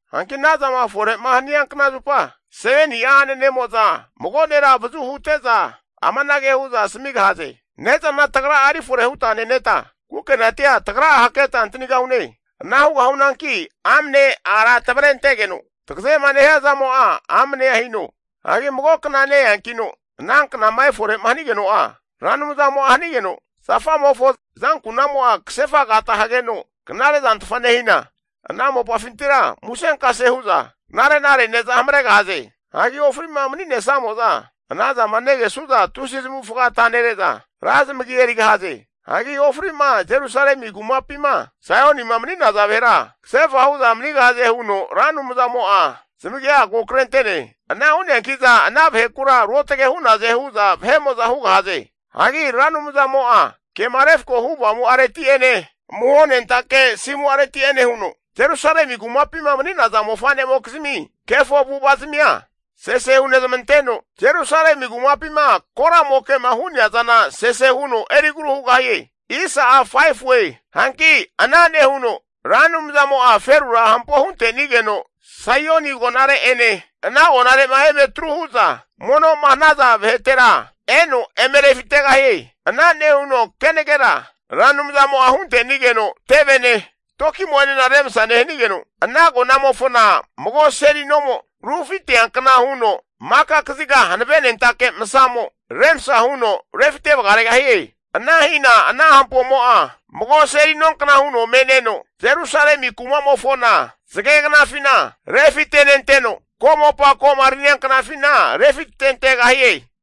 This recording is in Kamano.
Hanki ana zama fore'ma hania kna zupa, 7ni'a a'nanemo'za mago nera avazu hute'za amanage hu'za asamigahaze, Ne'zana tagra'a erifore huta neneta, kukenatia tagra'a haketa antanigahune. Ana hugahunanki amne ara tavrentegeno tagazema nehia zamo'a amne hino. Hagi mago kna ne-eankino ana knama efore'ma hanigeno'a, Ra Anumzamo'a hanigeno zafamofo azankunamo'a kasefa agata hageno knare zantfa nehina, ana mopafintira musenkase hu'za knare'nare ne'za hamaregahaze. Hagi ofri'ma mani'nesamo'za anazama negesu'za, tusi zamavufaga atanere'za ra zamagi erigahaze. Hagi ofri'ma Jerusalemi kumapima Saionima mani'naza vahera, kasefa hu'za manigahaze huno Ra Anumzamo'a zamagia ko krente'ne. Ana hu'neanki'za ana vahekura ruotage hu'naze hu'za vahe'mo'za hugahaze. Hagi Ra Anumzamo'a kema refko hu avamu'areti'ene amuho nentake asimu'areti'ene huno Jerusalemi kumapima mani'naza mofanemokizmi kefo avu'avazamia sese hunezmanteno, Jerusalemi kumapima koramoke'ma hu'nea zana sese huno erigru hugahie. Hanki ana nehuno Ra Anumzamo'a ferura hampo huntenigeno, Saioni agonare'ene ana agonare'ma eme atru hu'za mono'ma hanaza vahetera eno eme refitegahie. Ana nehuno kenagera Ra Anumzamo'a hunte'nigeno tevene toki'mo'ene remsa nehanigeno, ana agonamofona mago seli nomo rufiteankna huno maka kaziga hanavenentake masamo remsa huno rufite vagaregahie. Ana hina ana hampomo'a mago seli nonkna huno me'neno, Jerusalemi kuma'mofona, zagegnafina refite'nenteno ko'mopa ko'ma rania knafina refitentegahie.